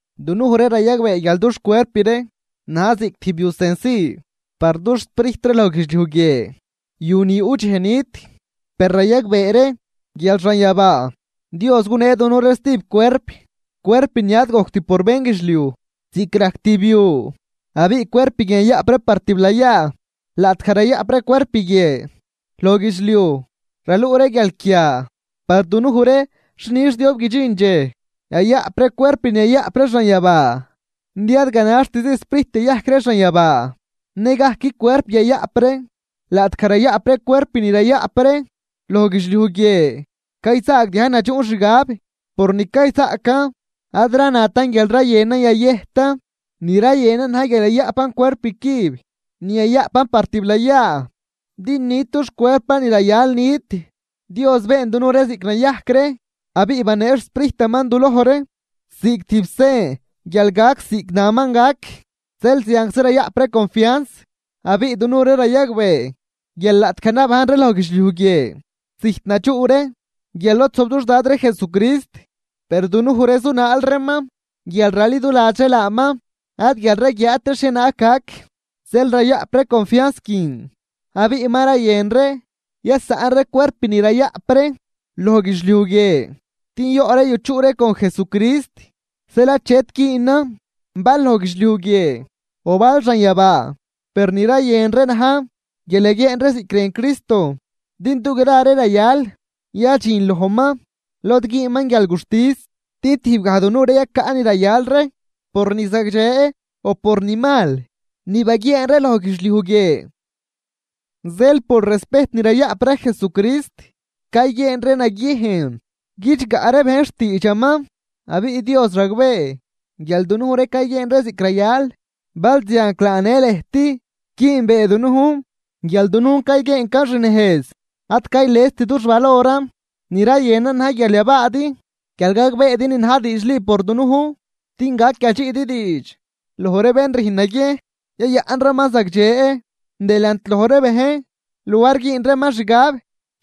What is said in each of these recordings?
Dunuj ree rayagbee guial dux cuerp ree na̱j ziꞌc tijb yu cenci par dux sprijt ree loj guidxliuj guie, yu ni yuꞌ dxej nit. Per rayagbee ree guial xanyabaa Dios gunee dunuj ree stijb cuerp, cuerp ni ad gojct por bénguidxliuj ziꞌc rajc tijb yu, abiꞌ cuerp guin yayaꞌp ree par tiblayaa. Laꞌtgaj rayaꞌp ree cuerp guie loj guidxliuj raluꞌ ree guialquia, par dunuj ree xi nix diob guidxin dxej yayaꞌp ree cuerp ni yayaꞌp ree xanyabaa. Din ad ganaxtizi Sprijt yayajc ree xanyabaa, nëgajc cuerp yayaꞌp ree. Laꞌtgaj rayaꞌp ree cuerp ni rayaꞌp ree loj guidxliuj guie, cayzaagdiajn nadxuꞌn xgab por ni cayzaꞌcan. Ad ranatan guial rayënan yayëjtan, ni rayënan na̱j guial yayaꞌpan cuerp cüb ni yayaꞌpan par tiblayaa din nit dux cuerpan ni rayal nit. Dios been dunuj ree ziꞌc nayajc ree abiꞌ banee xSprijtaman duloj ree ziꞌc tijb sen guial gac ziꞌc naman gac. Zeel zianczi rayaꞌp ree confians, abiꞌ dunuj ree rayagbee guial laꞌtgaj nabajn ree loj guidxliuj guie, zijt nadxuꞌ ree guial lod zojb dux Dad ree Jesucrist. Per dunuj ree zunaal reeman guial raliduladx ree laaman ad guial raguiaat ree xhienaag gac. Zeel rayaꞌp ree confians guin, abiꞌ ma rayën ree yasaꞌn ree cuerp ni rayaꞌp ree loj guidxliuj guie din yoꞌ ree yuchuꞌ ree con Jesucrist. Zeel achet güünan bal loj guidxliuj guie o bal xanyabaa, per ni rayën ree na̱j guial yaguieen ree ziꞌc rën Cristo. Din dugra ree rayal yadxin lojman lod güünman guialguxtis din tijbgaj dunuj ree yacaꞌ ni rayal ree, por ni zagdxe o por ni mal ni baguieen ree loj guidxliuj guie. Zeel por respejt ni rayaꞌp ree Jesucrist, cayguieen ree naguiejn guidxgaꞌ ree bejn xtiidxaman. Abiꞌ Dios ragbee guial dunuj ree cayguieen ree ziꞌc rayal, balzianclaa në lëjt güünbee dunujn guial dunujn cayguieencan xnejz. Ad caylest dux valoran, ni rayënan na̱j guial yabaadi guial gagbeedi ni na̱j diidxli por dunujn, din gac yadxiꞌdi diidx loj ree bén rüjn naguiejn yayaꞌn reeman zagdxe delant loj ree bejn luar güün reeman xgab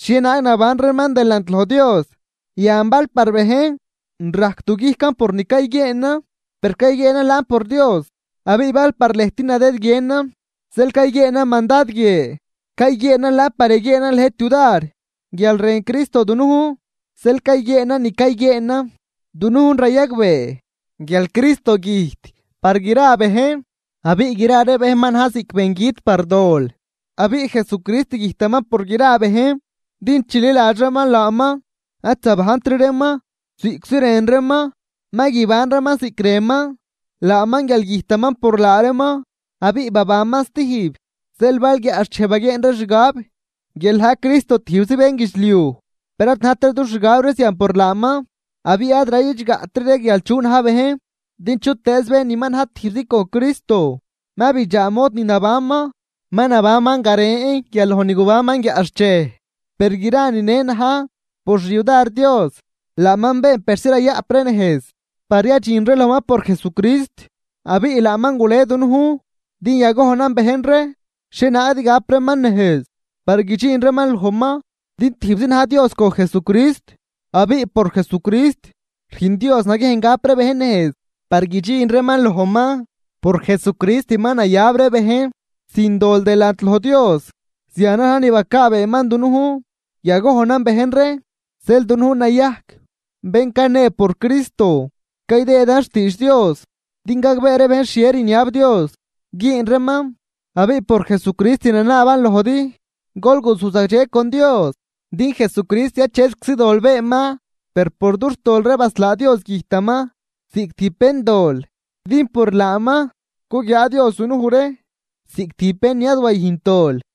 xhienaag naban reeman delant loj Dios. Yan bal par bejn rajc duguijcan por ni cayguieenan, per cayguieenan laan por Dios. Abiꞌ bal par lëjt nadëdguienan zeel cayguieenan mandad guie, cayguieenan laan par yaguieenan lëjt yudar. Guial rën Cristo dunujn zeel cayguieenan ni cayguieenan, din dunujn rayagbee guial Cristo güjt par gra bejn abiꞌ gra ree bejn ma na̱j ziꞌc bengüt par dol. Abiꞌ Jesucrist güjtaman por gra bejn din bén chililadx ree laaman ad zabajntri reeman ziꞌctzi rën reeman, ma guiban reeman ziꞌc rënman, laaman guial güjtaman por laa reeman abiꞌ babanman stijb. Zeel bal guiaꞌxchej baguieen ree xgab guial na̱j Cristo tijbzi bénguidxliuj, per ad najtri dux xgab ree zian por laaman. Abiꞌ ad rayidxgaꞌtri ree guial chu na̱j bejn, din chutëëz bén ma na̱j tijbzi con Cristo, ma bidxaa mod ni nabanman. Ma nabanman garen guial loj ni gubanman guiaꞌxchej. Per gra nine na̱j por xyudar Dios, laaman been persi rayaꞌp ree nejz par yadxin ree lojman por Jesucrist, abiꞌ laaman gule dunujn din yagojnan bejn ree xhienaag din gap reeman nejz par guidxin reeman lojman. Din tijbzi na̱j Dios con Jesucrist abiꞌ por Jesucrist rüjn Dios naguiejn gap ree bejn nejz par guidxin reeman lojman, por Jesucrist ma nayab ree bejn sin dol delant loj Dios, zianan na̱j ni bacaabeeman dunujn yagojnan bejn ree. Zeel dunujn nayajc bén canee por Cristo, caydëëdan xtiidx Dios din gagbee ree bejn xhie rniab Dios güün reeman. Abiꞌ por Jesucrist ranaaban lojdi: Gol guzuj zagdxe con Dios. Din Jesucrist achetczi dol beenman, per por dux tol ree baslaa Dios güjtaman ziꞌc tijb béndol din por laaman, cuguiaa Dios dunuj ree ziꞌc tijb bén ni ad wayüjnt dol.